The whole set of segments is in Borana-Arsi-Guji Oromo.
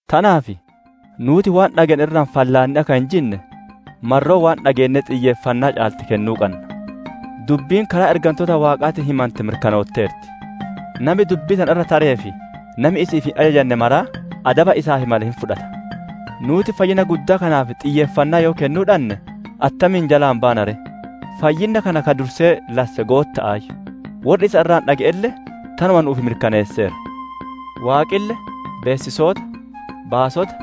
Tanaaf nuuti waan dhageenne irraa fallaannee akka hin jinne, marroo waan dhageennee xiyyeeffannaa caalte kennuu qanna. Dubbiin karaa ergantoota Waaqaatiin himante mirkanootteerti; nami dubbii tana irra taree fi nami isi'iif hin ajajanne maraa adaba isaaf male hin fudhata. Nuuti fayyinna guddaa kanaaf xiyyeeffannaa yoo kennuu dhanne attamiin jalaa baana ree? Fayyinna kana ka dursee lasse Gootta'aayyu; worri isa irraa dhage'elle tanuma nu'uuf mirkaneesseera. Waaqille beessisoota, baasota,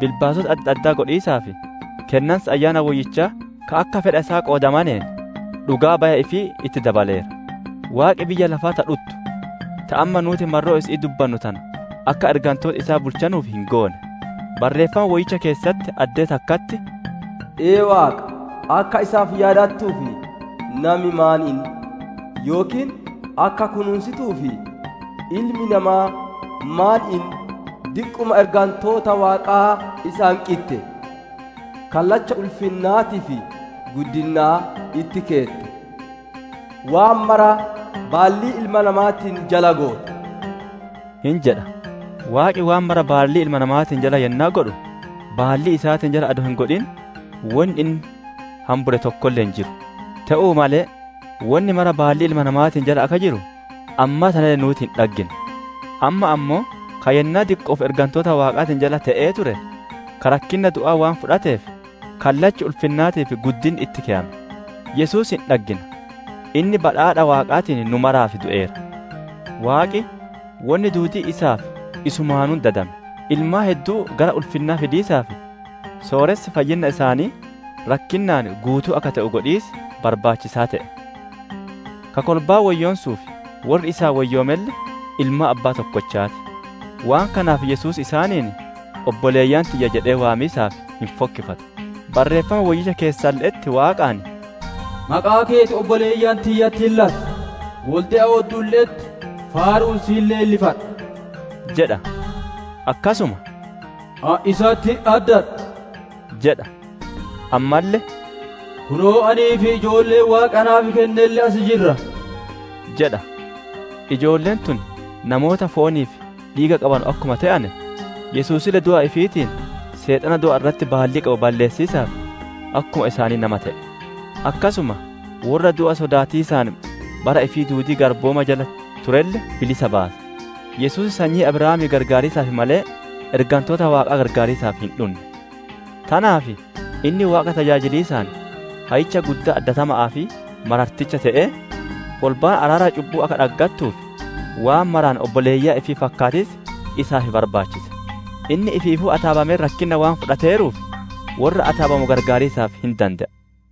bilbaasota adda addaa godhiisaa fi kennansa Ayyaana Woyyichaa ka akka fedha isaa qoodamaneen dhugaa baya ifii itti dabaleera. Waaqi biyya lafaa ta dhuttu, ta amma nuuti marroo isi'ii dubbannuu tana akka ergantooti isaa bulchanuuf hin goone. Barreeffama Woyyicha keessatti addee takkatti, «Ee Waaqa, akka isaaf yaadattuuf, nami maan inni? Yookiin akka kunuunsituuf, ilmi namaa maan inni? Diqquma ergantoota Waaqaa isa hanqitte; kallacha ulfinnaatii fi guddinnaa itti keette; waan mara baallii ilma namaatiin jala goote» hin jedha. Waaqi waan mara baallii ilma namaatiin jala yennaa godhu, baallii isaatiin jala adoo hin godhin wonni inni hambure tokkolle hin jiru. Te'uu malee wonni mara baallii ilma namaatiin jala akka jiru ammaa tanalle nuuti hin dhaggine. Amma ammoo ka yennaa diqqo'oof ergantoota Waaqaatiin jala te'ee ture, ka rakkinna du'aa waan fudhateef kallachi ulfinnaatii fi guddinni itti keyame, Yesuus hin dhaggina; inni badhaadha Waaqaatiin nu maraaf du'eera. Waaqi wonni duudiin isaa fi isumaanuu dadame, ilmaan hedduu gara ulfinnaa fidiisaaf, sooressi fayyinna isaanii rakkinnaan guutuu akka te'u godhiis barbaachisaa te'e. Ka kolbaa woyyoonsuu fi worri isaan woyyoomelle ilmaan abbaa tokkochaa ti; waan kanaaf Yesuus isaaniin, «Obboleeyyan tiyya» jedhee waamiisaaf hin fokkifatu. Bareeffama Woyyicha keessalle'etti Waaqaan, «Maqaa keeti obboleeyyan tiyyatti hin lassa; wolde'a odduulle'etti faaru'uun si hin leellifadha» jedha. Akkasuma, «Ani isatti hin addadha» jedha; ammalle, «Kunoo, anii fi ijoolleen Waaqi naaf kennelle as jirra» jedha. Ijoolleen tun namoota foonii fi dhiiga qabanu akkuma te'ane, Yesuusille du'a ifiitiin, Seexana du'a irratti baallii qabu balleessiisaaf, akkuma isaanii nama te'e. Akkasuma worra du'a sodaatiisaan bara ifii duudii garbummaa jala turelle bilisa baase. Yesuus sanyii Abrahaamii qarqaariisaaf malee, ergantoota Waaqaa gargaariisaaf hin dhunne. Tanaaf inni Waaqa tajaajiliisaan Hayyicha Guddaa addatama'aa fi mararticha te'ee, kolbaan araara cubbu'uu akka dhaggattuuf, waan maraan obboleeyyan ifii fakkaatiis isaaf barbaachise. Inni ifiifuu ataabamee rakkinna waan fudhateeruuf, worra ataabamu qarqaariisaaf hin dande'a.